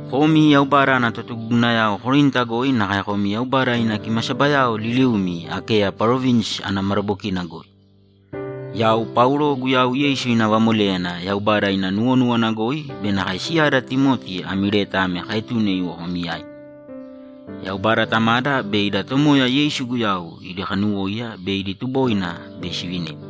Komi Yaubada ana totugugunayao Korinta goi nakae komi Yaubada ina kimasabayao liliumi Akeya parovinsi ana madabokina goi, Yau Paulo Guyau Yeisu ina vamoléyana Yaubada ina nuwonúwana goi be nakae siyada Timoti ami leta ame kaetune iwo komi yaimi. Yaubada Tamada be ida Tomoya Yeisu Guyau idi kanuwóiya be idi tuboina bei sivinimi.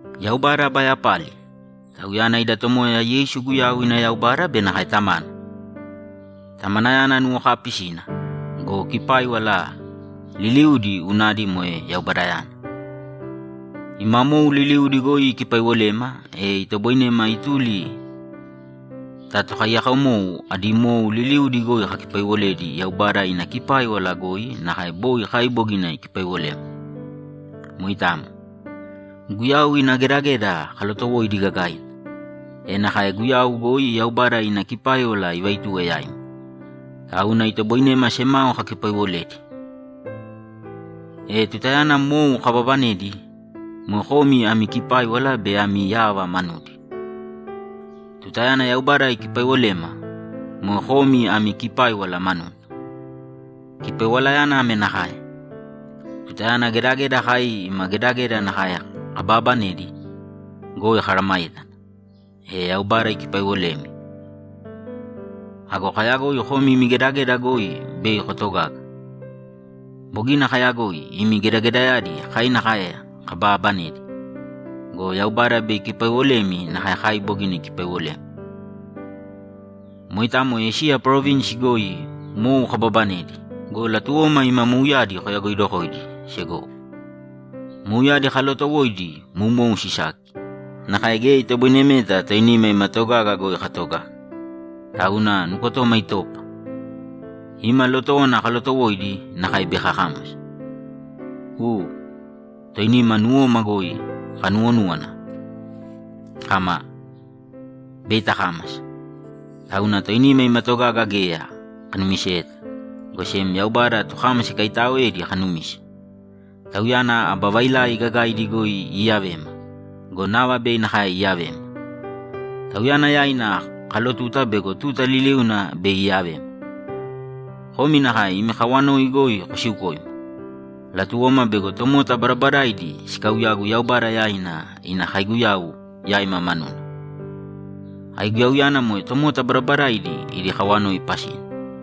Yaubada aba yapali! Tauyana ida Tomoya Yeisu Guyau ina Yaubada be nakae Tamana! Tamanayana nuwokaapisina go, kipáiwala liliudi unadi moe Yaubadayana. Ima mou liliudi goi ikipaiwolema e itoboinema ituli ta tokaiyakomou adi mou liliudi goi kakipaiwoledi Yaubada ina kipáiwala goi nakae boi kai bogina ikipaiwolema. Moitamo. Guyau ina gedageda kalotowoidi gagaina, e nakae Guyau goi Yaubada ina kipáiwala ivaituwe yaima. Tauna itoboinema semao kakipaiwoledi. E tutayana mou kababanedi, moe komi ami kipáiwala be ami yava manudi. Tutayana Yaubada ikipaiwolema, moe komi ami kipáiwala manuna. Kipaiwalayana ame nakae: Tutayana gedageda kai ima gedageda nakae kobaabanedi goi komeesayágana, e Yaubada ikipaiwolemi. Ago kayagoi komi imi gedageda goi bei kotogaga. Bogina kayagoi imi gedagedayadi kai nakae kobaabanedi go, Yaubada bei ikipaiwolemi nakae kai bogina ikipaiwolema. Moitamo Esiya parovinsi goi mou kababanedi go, latuwoma ima mouyadi koyagoidokoidi, segowo. Mouyadi kalootowoidi moumou sisaki, nakae geya itoboinemeta toinima ima togaga goi katogaga, tauna nukotoma itopa; ima lotówana kalotowoidi nakae bei kakámasa. U. Toinima nuwoma goi kanuwonúwana kama, ‘Bei takámasa!’ Tauna toinima ima togaga geya kanumiseyeta, go sem Yaubada tokámasa ikaitaaoedi kanumise. Tauyana aba vailai gagaidi goi iiyavema go, nava bei nakae iiyavema. Tauyana yaina kalotuta bego tuta liliuna bei iiyavema. Komi nakae imi kawanoi goi kosiukōima. Latuwoma bego tomota badabadaidi sikauyagu Yaubada yaina ina kaiguyau yaima manuna; aiguyauyana moe tomota badabadaidi idi kawanoi pasina.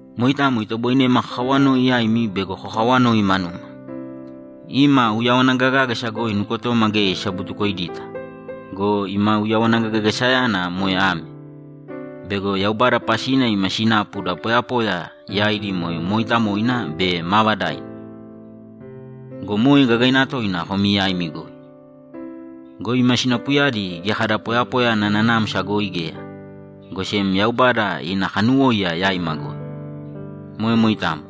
Moitamo itoboinema kakawanoi yaimi bego kokawanoi manuma. Ima uyawana gagágasa goi nukotoma geya isabutukoidita go, ima uyawana gagagasayana moe ame: Bego Yaubada pasina ima sinapu da poyapoya yaidi moe mooitamoina be maavadaina go, moe gagaina toina komi yaimi goi. Go ima sinapuyadi geya kada poyapoya ana nanamsa goi geya, go sem Yaubada ina kanuwóiya yaima goi. Moe moitamo.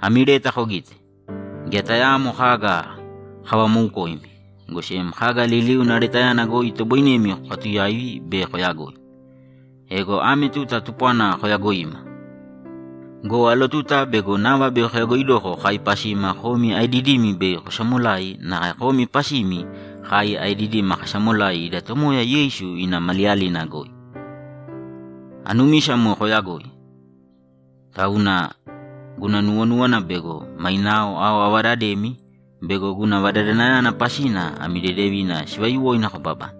Ami leta kogīte. Geya tayaamo kaga kavamoukoimi, go sem kaga liliuna letayana goi itoboinemi kokatuyaivi be koyagoi. Ego ame tuta tupwana koyagoima go, alotuta bego nava bei koyagoidoko kai pasima komi aedidimi bei kosamolai nakae komi pasimi kai aedidima kasamolai ida Tomoya Yeisu ina maliyalina goi. Anumisa moe koyagoi, tauna guna nuwonúwana bego mainao ao avadademi bego guna vadadanayana pasina ami dedevina sivayuwoina kobabane.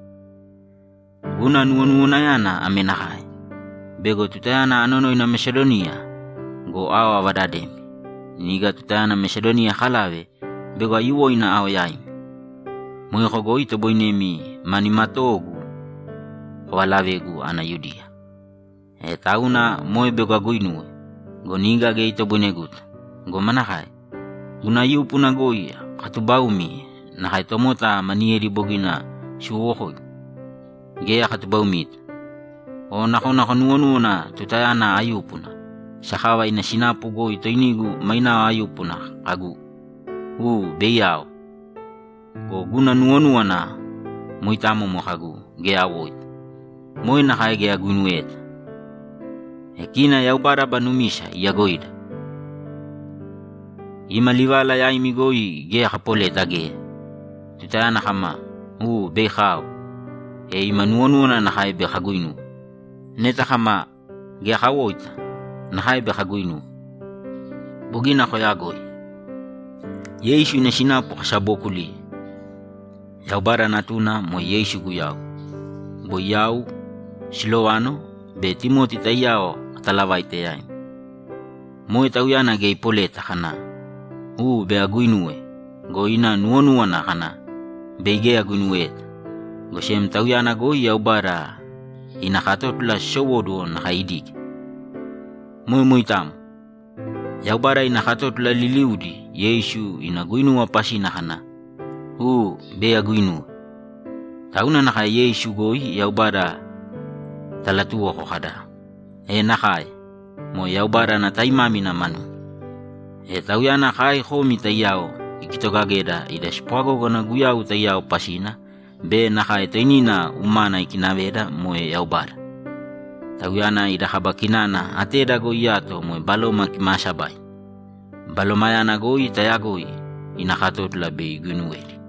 Guna nuwonuwanayana ame nakae: Bego tutayana anonoina Mesadoniya go, ao avadademi. Niga tutayana Mesadoniya akalave, bego aiyuwoina ao yaimi. Moeko goi itoboinemi ma nimatoogu kovalavegu ana Yudiya. E tauna moe bego aguinuwe go, niga geya itoboineguta. Go manakae? Guna yúpuna goi akatubaumi nakae tomota maniyedi bogina siwowokoigu? Geya akatubaumita! O nakona konuwonúwana tutayana ayúpuna, sakava ina sinapu goi toinigu mainao ayúpuna kagu, ‘U, bei ao.’ Go, guna nuwonúwana moitamo moe kagu, ‘Geya awoita.’ Moe nakae geya aguinuweyeta. E kina Yaubada aba numisa iyagoida! Ima livala yaimi goi geya kapoleta geya! Tutayana kama, ‘U, bei kao’, e ima nuwonúwana nakae bei kaguinuwe. Neta kama, ‘Geya kawoita’, nakae bei kaguinuwe. Bogina koyagoi. Yeisu ina sinapu kasabookuliye. Yaubada Natuna, moe Yeisu Guyau, boi yau, Silovano be Timoti taiyao katalavaite yaimi. Moe Tauyana geya ipoleta kana, ‘U, bei aguinuwe’ go, ina nuwonúwana kana, ‘Bei geya aguinuweta.’ Go sem Tauyana goi Yaubada ina katótula sisowóduwo nakae idige. Moe moitamo. Yaubada ina katótula liliudi Yeisu ina guinuwa pasina kana, ‘U, bei aguinuwe.’ Tauna nakae Yeisu goi Yaubada talatuwoko kada, ‘E nakae!’ Moe Yaubada ana taimámina manuna. E Tauyana kai komi taiyao ikitogageda ida spwagógana Guyau taiyao pasina be nakae toinina umana ikinaveda moe Yaubada. Tauyana ina kaba kinana ateda goi iyato moe Baloma Kimaasabaina. Balomayana goi tayagoi ina katótula bei iguinuwedi.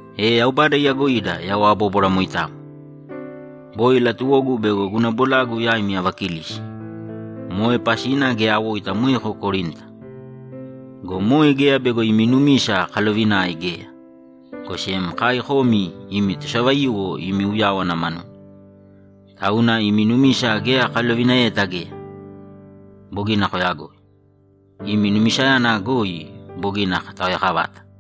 E Yaubada iyagoida yau abóbwara moitamo! Boi latuwogu bego guna bolagu yaimi avakilisi. Moe pasina geya awoita moeko Korinta. Go moe geya bego imi numisa kalovinae geya, go sem kai komi imi tosavaiyuwo imi uyáwana manuna. Tauna imi numisa geya kalovinaeyeta geya. Bogina koyagoi. Imi numisayana goi bogina kotaoyakavata!